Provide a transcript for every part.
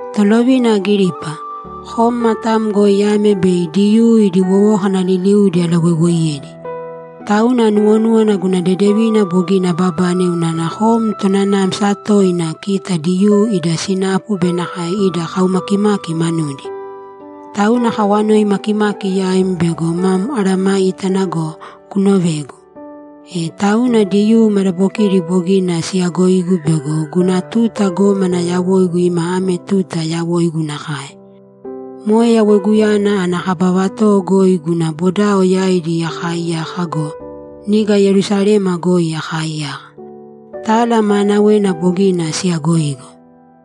‘Tolovina Agiripa, kom matam goi ame bei Diyuu idi wowókana liliudi alawoiwoiyedi. Tauna anuwonúwana guna dedevina bogina ababane unana kom tonanamsa toina kita Diyuu ida sinapu be nakae ida kaumakimaki manudi. Tauna akawanoi makimaki yaim bego mam mesayágana go, kunovēgu. E tauna Diyuu madabokidi bogina siyagoigu bego guna tuta gómana yawoigu ima ame tuta yawoigu nakae. Moe yawoiguyana ana kaba vatowo goi guna bodao yaidi akaaiyaka go, niga Yerusalema goi akaaiyaka. Tala maanawena bogina siyagoigu.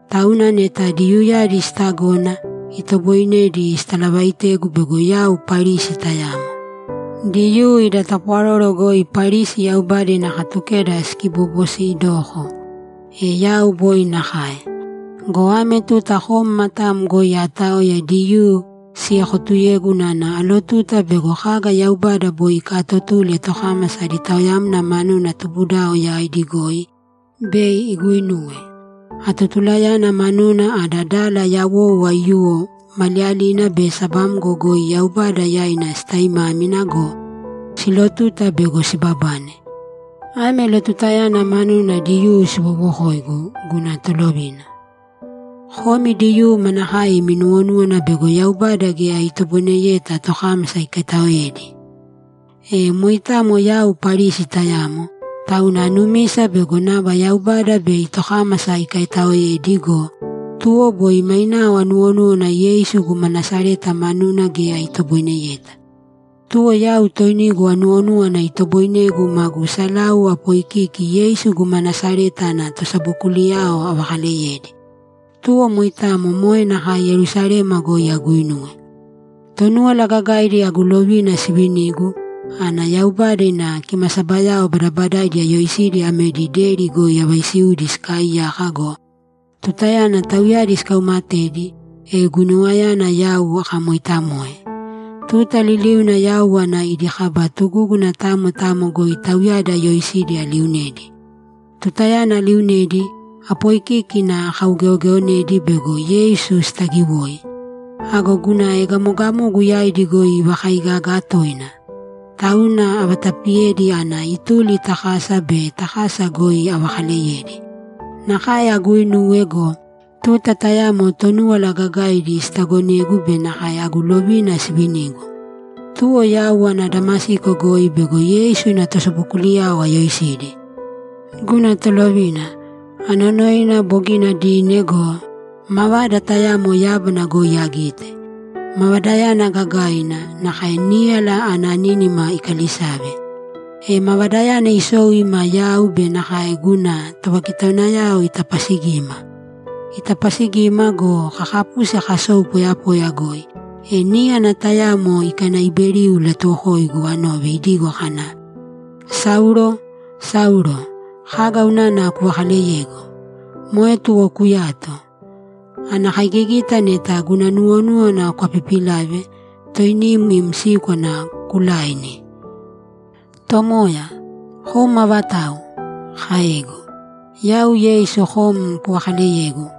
Tauna neta Diyuuyadi sitagona, itoboinedi sitalavaitegu bego yau Parisi tayamo. Diyuu ida tapwaroro goi Parisi Yaubada ina Katukeda sikiboboosidoko. E yau boi nakae. Go ame tuta kom matam goi aataoya Diyuu siekotuyegu unana alotuta bego kaga Yaubada boi ikaatotule tokámasa adi taoyamna manuna tubudao yaidi goi, bei iguinuwe. Atotulayana manuna ada dala yawou aiyuwo maliyalina be sabamgo goi Yaubada yaina sitaimámina go, siilotuta bego sibabane. Ame lotutayana manuna Diyuu siwowokoigu, guna Tolovina. Komi Diyuu manakae imi nuwonúwana bego Yaubada geya itoboineyeta tokámasa ikaitaoedi? E moitamo yau Parisi tayamo, tauna anumisa bego nava Yaubada bei tokámasa ikaitaoedi go, tuwo boi mainao anuwonúwana Yeisu guma Nasareta manuna geya itoboineyeta. Tuwo yau toinigu anuwonúwana itoboinegu magu salau apoikiki Yeisu guma Nasareta ana tosabokuliyao avakaleyedi. Tuwo moitamo moe nakae Yerusalema goi aguinuwe. Tonúwala Gagaidi agu lovina sivinigu, ana Yaubada ina kimasabayao badabadaidi ayoisidi amedi deri goi avaisiudi sikaaiyaka go, tutayana tauyadi sikaumatedi, e guinuwayana yau akamoitamoe. Tuta liliuna yau ana idi kaba tugúguna tamo tamo goi tauyadi ayoisidi aliunedi. Tutayana aliunedi, apoikíkina akaugeogeonedi bego Yeisu sitagiwoi. Ago guna egamogamogu yaidi goi ivakaigaga toina, tauna avatapiyedi ana ituli ta kasa be ta kasa goi avakaleyedi. Nakae aguuinuwe go, tuta tayamo Tonúwala Gagaidi sitagonegu be nakae agu lovina sivinigu. Tuwo yau ana Damasiko goi bego Yeisu ina tosabokuliyao ayoisidi. Guna tolovina, anonoina, bogina dine go, mavada tayamo yábana goi agite. Mavadayana gagaina, nakae níyala ana nínima ikalisave. E mavadayana isou ima yau be nakae guna tovakitaunayao itapasigima. Itapasigima go, kakapusi kasou poyapoya goi, e níyana tayamo ikanaiberiu ilatuwokoigu anove idigo kana, “Saulo, Saulo, kaga unana kuvakaleyegu? Moe tuwo kuyāto! Ana kaigigita neta guna nuwonúwana kwapipilave, toinim im síkwana kulaini.” “Tomoya, kom avatau?” kaegu. “Yau Yeisu kom kuvakaaleyegu.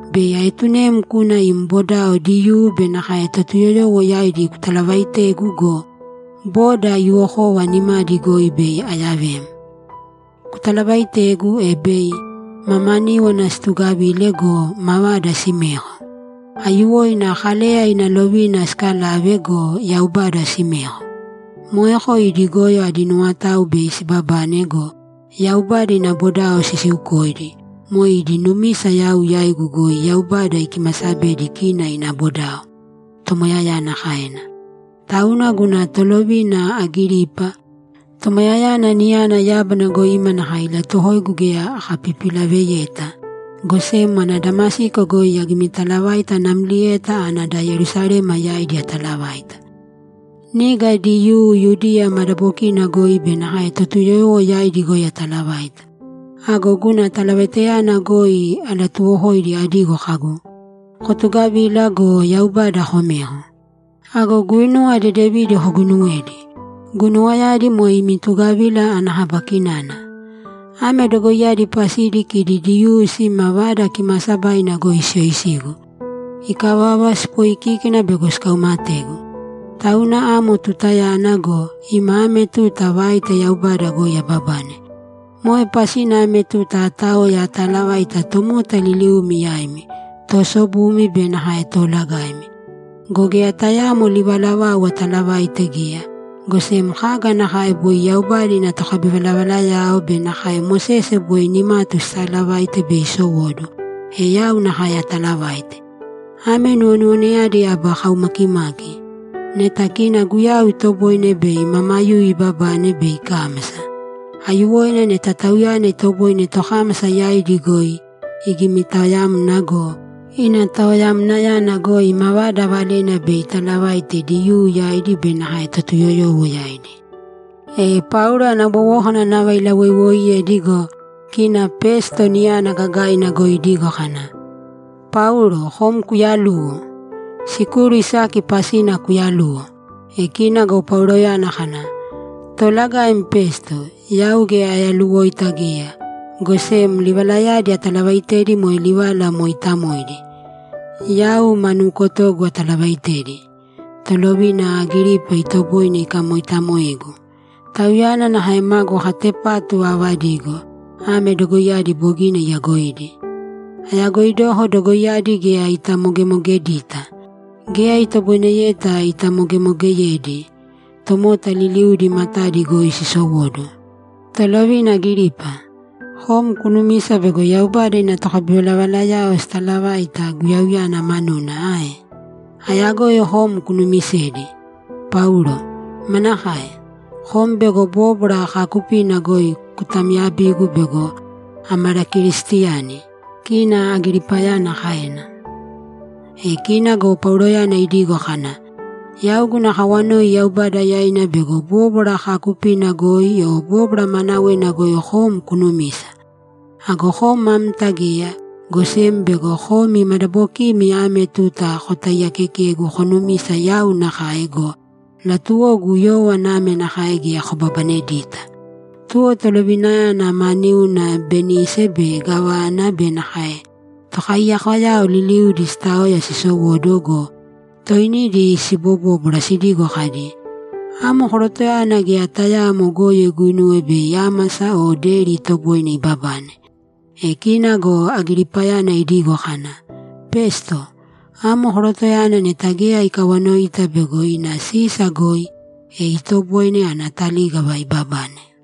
Bei aetunem kuna im bodao Diyuu be nakae Totuyoyowo yaidi kutalavaitegu go, boda aiyuwokova nimadi goi bei ayavem. Kutalavaitegu, e bei mamaníwana situgavile go, mavada simeko. Aiyuwoina Kaleya ina lovina sikalave go, Yaubada simeko. Moeko idi goyo adi nuwotao bei sibabane go, Yaubada ina bodao sisiukoidi, moe idi numisa yau yaigu goi Yaubada ikimasabedi kina ina bodao”, Tomoyayana kaena. Tauna guna tolovina Agiripa, Tomoyayana niyana yábana goi ima nakae ilatuwokoigu geya akapipilaveyeta, go sem ana Damasiko goi agimitalavaita namlieta ana da Yerusalema yaidi atalavaita. Niga Diyuu Yudiya madabokina goi be nakae Totuyoyowo yaidi goi ataalavaita. Ago guna talavaitayana goi alatuwokoidi adigo kagu, “Kotugavīla go, Yaubada komēko. Ago guinuwa dedevidi koguinuwēdi. Guinuwayadi moe imi tugavila ana kaba kinana.” Ame dogoiyadi pasidi kidi Diyuu sima Vada Kimaasabaina goi siyoisigu. Ikavava, sipooikíkina bego sikaumategu. Tauna amo tutayana go, ima ame tuta vaita Yaubada goi ababane. Moe pasina ame tuta aataoya ataalavaita tomota liliumi yaimi, toosobumi be nakae toolagaimi. Go geya tayaamo livala vau atalavaite geya, go sem kaga nakae boi Yaubada ina tokabivalavalayao be nakae Mosese boi nimatu sitaalavaite bei isowóduwo, e yau nakae ataalavaite. Ame nuwonuwonayadi aba kaumakimaki: Neta kina Guyau itoboine bei mamayuyu ibabane be ikámasa. Aiyuwoina neta Tauyana itoboine tokámasa yaidi goi igimitaoyamna go, ina taoyamnayana goi mavada valena bei italavaite Diyuu yaidi be nakae Totuyoyowo yaidi.’ E Paulo ana wowókana nava ilawoiwooiyedi go, kina Pesto niyana gagaina goi idigo kana, ‘Paulo, kom kuyaluwo! Sikuru isaki pasina kuyaluwo!’ E kina go Pauloyana kana, ‘Toolagaim Pesto, yau geya ayaluwoita geya, go sem livalayadi atalavaaitedi moe livala moitaamoidi; yau ma nukotogu atalavaaitedi. Tolovina Agiripa itoboine ikamoitamoegu. Tauyana nakae magu katepatu aavadigo; ame dogoiyadi bogina iyagoidi. Ayagoidoko dogoiyadi geya itamogemogeyedita. Geya itoboineyeta itamogemogeyedi. Tomota liliudi matadi goi sisowóduwo! Tolovina Agiripa, kom kunumisa bego Yaubada ina tokabivalavalayao sitalavaita Guyauyana manuna ae? Ayagoi kom kunumisedi.’ ‘Paulo, manakae? Kom bego bóbwara kaakupina goi kutamyabigu bego amalakeristiyani’, kina Agiripayana kaena. E kina go Pauloyana idigo kana, ‘Yau guna kawanoi Yaubada yaina bego bóbwara kaakupina goi o bóbwara maanawena goi kom kunumisa. Ago kom amta geya, go sem bego komi madabokimi ame tuta kotaiyaakekegu konumisa yau nakae go, latuwogu yówana ame nakae geya kobabanedita.’ Tuwo tolovinayana ma niuna Benise be gávana be nakae tokaiyakoyao liliudi sitaoya sisowóduwo go, toinidi sibobóbwara sidigo kadi, ‘Amo korotoyana geya tayaamo goyo iguinuwe bei ámasa o deri itoboine ibabane.’ E kina go Agiripayana idigo kana, ‘Pesto, amo korotoyana neta geya ikawanoita bego ina Sisa goi, e itoboine ana talígava ibabane.’